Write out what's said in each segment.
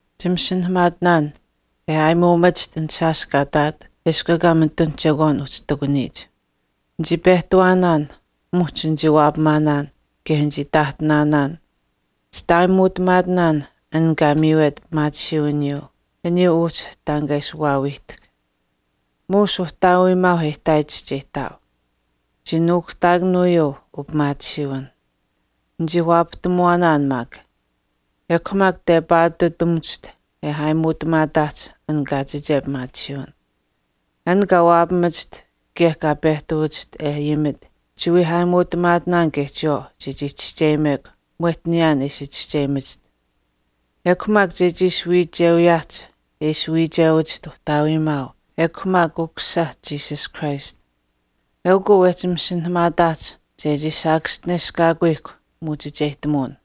Chimasinahamaatinaan e aayimuumachiht an shaash kaa ihtaat eshkw ekaa mitun chekwaayuu uhchi ihtakuniyich. Nichii pehtawaanaan, muhch nichii waapamaanaan, kaye nichii taahtinaanaan. Chitaayimuutamaatinaan an kaa miiwet pimaatisiiwiniyuu aniyuu uhchi taan kaa ishi waawiihtahk. Muush Uhtaawiimaauh e ihtaayich chii ihtaau. Chii nuukuhtaakanuuyuu upimaatisiiwin. Nichii waapahtamuwaanaan. Ekw maak tepaatutamuwachiht, e aayimuutamaataahch kaachiche pimaatisiiwin. An kaa waapamachiht kaye kaa pehtawachiht e ayimit chiwii aayimuutamaatinaan kaye chiyawaau chechii chischeyimekw mwehch niyaan e ishi chischeyimachiht. Ekw maak chechii ishi wiichewiyaahch e ishi wiichewachiht Uhtaawiimaau ekw maak Ukusisa Jesus Christ. Eukw uu wehchi masinahamaataahch chechii saakaschineshkaakuyihkw muuchicheyihtamuwin.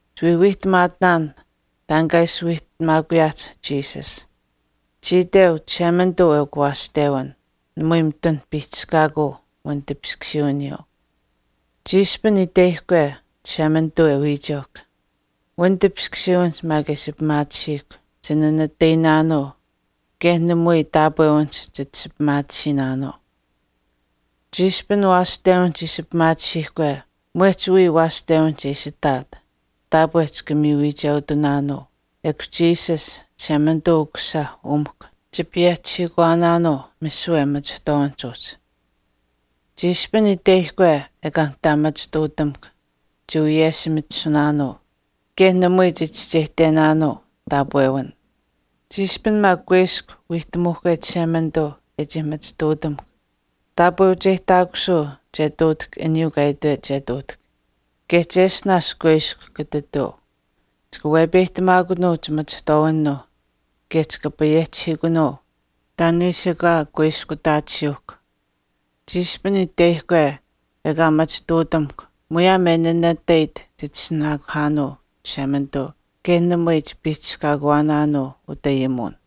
Chiwii wiihtamaatinaan taan kaa ishi wiihtamaakuyaahch Jesus. Chii iteu, Chishemanituu eukw waashtewin, namui mitun piihchishkaakuu wanitipiskusiiwiniyuu. Chiishpin itweyihkwe Chishemanituu e wiicheuhkw, wanitipiskusiiwinihch maak e ishi pimaatisiihkw, chinanatayinaanuu kaye namui taapwewinihch chit ishi pimaatisiinaanuu. Chiishpin waashtewinihch ishi pimaatisiihkwe mwehch wiya waashtewinihch e ishi ihtaat, taapwe chika miyu wiicheutunaanuu, kaye Jesus, Chishemanituu Ukusisa, umihkw chipayehchihiikuwaanaanuu misiwe machihtwaawinihch uhchi. Chiishpin itweyihkwe ekaa nihtaa machituutamukw, chiwiyeshimitisunaanuu, kaye namui chichischeyihtenaanuu taapwewin. Chiishpin maak kuiskw wiihtamuuhkwe Chishemanituu e chii machituutamuhkw, taapweucheyihtaakusuu che ihtuutahk aniyuu kaa itwet che ihtuutahk. Kaye cheshtinaash kuiskw kata ihtuu, Chika wepeyihtamaakunuu chimachihtwaawinuuh kaye chika payehchihiikunuu taan e ishi ekaa kuiskutaatisiyuuhkw. Chiishpin itweyihkwe ekaa machituutamuhkw muyaam e nanatayit chitishinaakuhaanuu Chishemanituu kaye namui chipiihchishkaakuwaanaanuu utayimuwin.